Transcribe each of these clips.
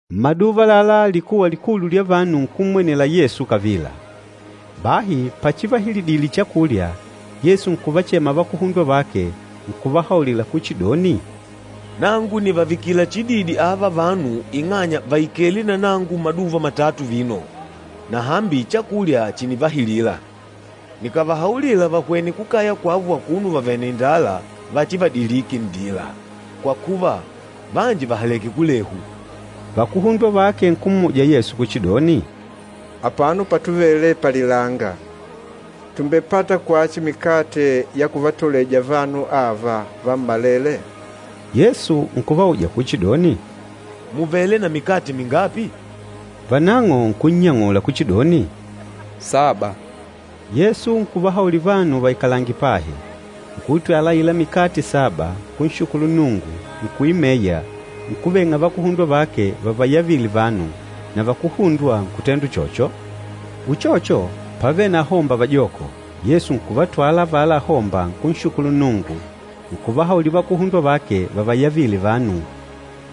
Mmaduva àlalá likuwa likulu lya vanu nkummwenela Yesu kavila. Bahi pachivahilidile chakulya, Yesu nkuvachema vakuhundwa vake nkuvahaulila kuchidoni, “Nangu nìvavikila chididi ava vanu ing'anya vàikele na nangu maduva matatu vino, na hambi chakulya chìnivahilila. Nikàvahaulila vahwene kukaya kwavo akuno vavèlè na indala vachivadilike nndila, kwa kuva vanji vàhaleke kulehu.” Vakuhundwa vake nkummuja Yesu kuchidoni, “Apano patuvele palilanga, tùmbepata kwachi mikate ya kuvatoleja vanu ava vammalele?” Yesu nkuvauja kuchidoni, “Mùvele na mikate mingapi?” Vanang'o nkunnyang'ula kuchidoni, “Saba.” Yesu nkuvahaulila vanu vaikalange pahi. Nkuitwala aila mikate saba, nkunshukulu Nnungu, nkuimeya, nkuveng'a vakuhundwa vake vavayavile vanu, na vakuhundwa nkutenda uchocho. Uchocho, pávele na ahomba vajoko, Yesu nkuvatwala avala ahomba nkunshukulu Nnungu, nkuvahaulila vakuhundwa vake vavayavile vanu.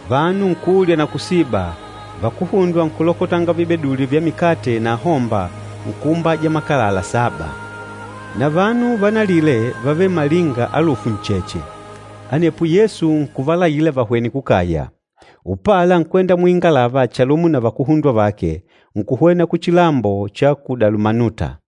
Vanu nkulya na kusiba, vakuhundwa nkulokotanga vibeduli vya mikate na ahomba, nkuumbaja makalala saba. Na vanu vanalile vávele malinga alufu ncheche. Anepo Yesu nkuvalaila vahwene kukaya, upala nkwenda muingalava chalumo na vakuhundwa vake, nkuhwena kuchilambo cha ku Dalumanuta.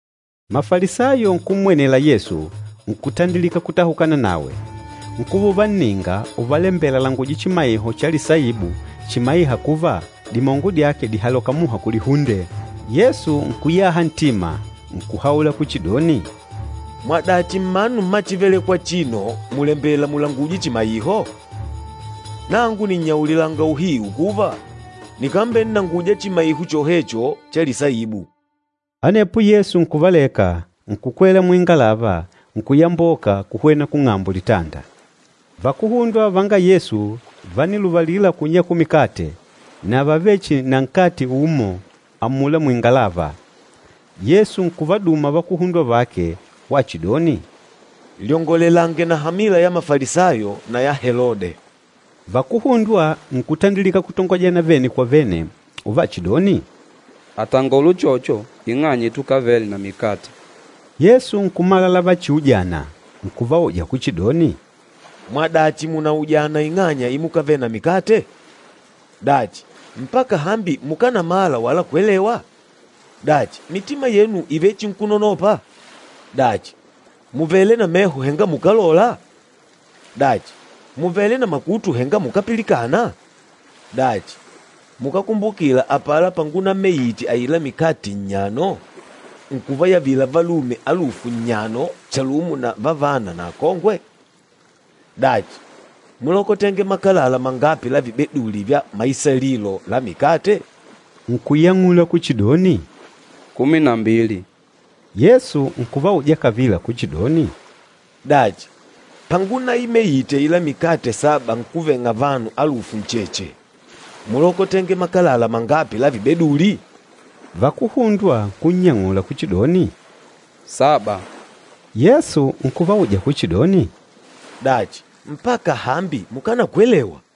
Mafalisayo nkummwenela Yesu, nkutandilika kutahukana nawe. Nkuva uvanninga uvalembela alanguje chimaiho cha lisaibu chimaîha kuva dimongo dyake dìhaloka muha kulihunde. Yesu nkuyaha ntima, nkuhaula kuchidoni, “Mwadachi mmanu mma chívelèkwà achino mùlembela mulangujwe chimaiho? Nangu nìnnyaulilanga uhiu kuva, nikambennanguja chimaiho chohecho cha lisaibu.” Anepo Yesu nkuvaleka, nkukwela muingalava, nkuyamboka kuhwena kung'ambo litanda. Vakuhundwa vanga Yesu vániluvalila kunyakula mikate, na vávele chihi na nkate umo amula muingalava. Yesu nkuvaduma vakuhundwa vake wachidoni, “Lyongolelange na hamila ya Mafalisayo na ya Helode.” Vakuhundwa nkutandilika kutongojana vene kwa vene uvachidoni, “Àtangola uchocho ing'anya itukavele na mikate.” Yesu nkumala lavachiujana, nkuvauja kuchidoni, “Mwadachi mùnaujana ing'anya imukavele na mikate? Dachi, mpaka hambi mukánamala wala kwelewa? Dachi, mitima yenu ìvechinkunonopa? Dachi, mùvele na meho henga mukálola? Dachi, mùvele na makutu henga mukápilikana? Dachi, mukákumbukila apala pangunaimeite aila mikate nnyano nkuvayavila valume alufu nnyano chalumo na vavana na akongwe? Dachi, múlokotenge makalala mangapi la vibeduli vya maisalilo la mikate?” Nkunyang'ula kuchidoni, “Kumi na mbili.” Yesu nkuvauja kavila kuchidoni, “Dachi, pangunaimeite aila mikate saba nkuveng'a vanu alufu ncheche, múlokotenge makalala mangapi la vibeduli?” Vakuhundwa nkunnyang'ula kuchidoni, “Saba.” Yesu nkuvauja kuchidoni, “Dachi, mpaka hambi mukánakwelewa?”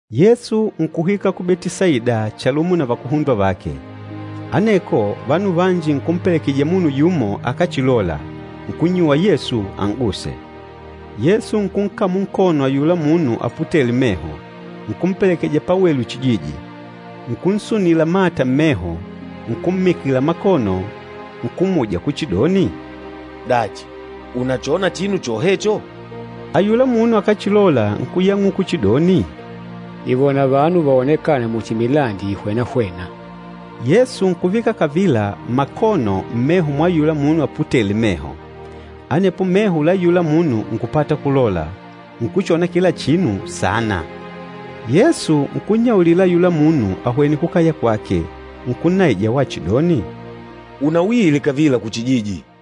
Yesu nkuhwika ku Betisaida chalumo na vakuhundwa vake. Aneko vanu vanji nkumpelekejija munu yumo akáchilola, nkunnyuwa Yesu an'guse. Yesu nkunkamula nkono ayula munu aputêle meho, nkumpelekeja pawelu chijiji. Nkunsunila mata mmeho, nkummikila makono, nkummuja kuchidoni, “Dachi, ùnachona chinu chohecho?” Ayula munu akáchilola, nkuyang'uka kuchidoni, “Nìvona vanu vaonekâna muchi milandi ìhwenahwena.” Yesu nkuvika kavila makono mmeho mwa ayula munu aputêle meho. Anepo meho la ayula munu nkupata kulola, nkuchona kila chinu saana. Yesu nkunnyaulila ayula munu ahwene kukaya kwake, nkunnaija wachidoni, “Unauile kavila kuchijiji!”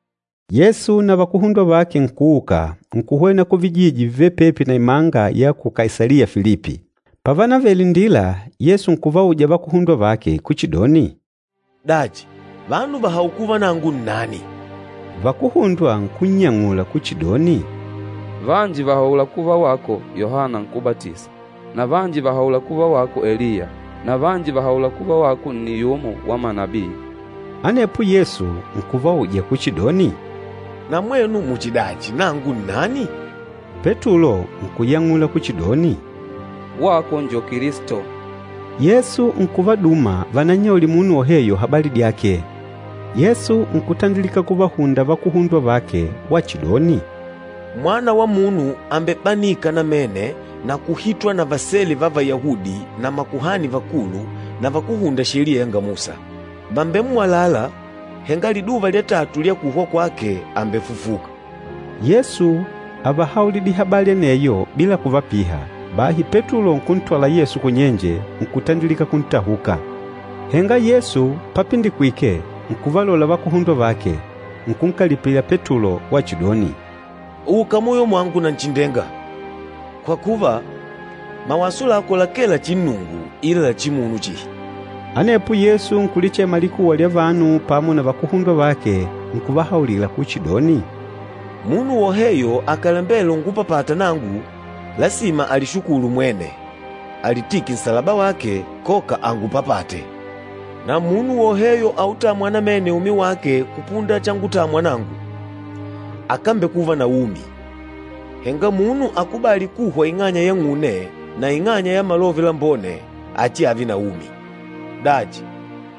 Yesu na vakuhundwa vake nkuuka, nkuhwena kuvijiji vivêle pepi na imanga ya ku Kaisaliya Filipi. Pávanavele nndila, Yesu nkuvauja vakuhundwa vake kuchidoni, “Dachi, vanu vàhaula kuva nangu nnani?” Vakuhundwa nkunnyang'ula kuchidoni, “Vanji vàhaula kuva wako Yohana Nkúbatisa, na vanji vàhaula kuva wako Eliya na vanji vàhaula kuva wako nni yumo wa manabii.” Anepo Yesu nkuvauja kuchidoni, “Na mwenu muchidachi, nangu nnani?” Petulo nkuyang'ula kuchidoni, “Wako njo Kilisto.” Yesu nkuvaduma vanannyaulile munu woheyo habali dyake. Yesu nkutandilika kuvahunda vakuhundwa vake wachidoni, “Mwana wa Munu àmbebanika namene na kuhitwa na vasele va Vayahudi na makuhani vakulu na vakúhunda Sheliya ya Musa. Vàmbemmwalala, henga liduva lya tatu lya kuhwa kwake àmbefufuka.” Yesu ávahaulidile habali aneyo bila kuvapiha. Bahi Petulo nkuntwala Yesu kunyenje, nkutandilika kuntahuka. Henga Yesu papindikwike nkuvalola vakuhundwa vake, nkunkalipila Petulo wachidoni, “Uka muyo mwangu Nanchindenga! Kwa kuva, mawaso lako lakee la chinnungu ila la chimunu chihi.” Anepo Yesu nkulichema likuwa lya vanu pamo na vakuhundwa vake, nkuvahaulila kuchidoni, “Munu woheyo akàlembela ungupapata nangu, lasima alishukulu mwene, alitike nsalaba wake, koka angupapate. Na munu woheyo autâmwa namene umi wake kupunda changutamwa nangu, akámbekuva na umi, henga munu akubâli kuhwa ing'anya yang'une na ing'anya ya Malove Lambone achiave na umi. Dachi,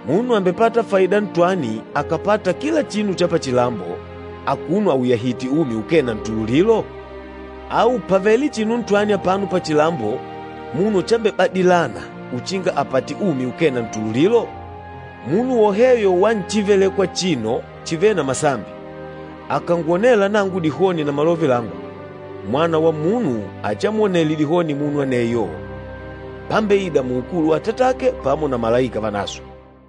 munu àmbepata faida ntwani akàpata kila chinu cha pachilambo, akuno auyahìtè umi ukee na ntululilo? Au pàvele chinu ntwani apano pachilambo munu chambebadilana uchinga apate umi ukee na ntululilo? Munu woheyo wa nchívelèkwà achino chivêle na masambi, akàngwonela nangu dihoni na malove langu, Mwana wa Munu achiamwonele dihoni munu aneyo, pambeida muukulu wa Atatake pamo na malaika vanaswe.”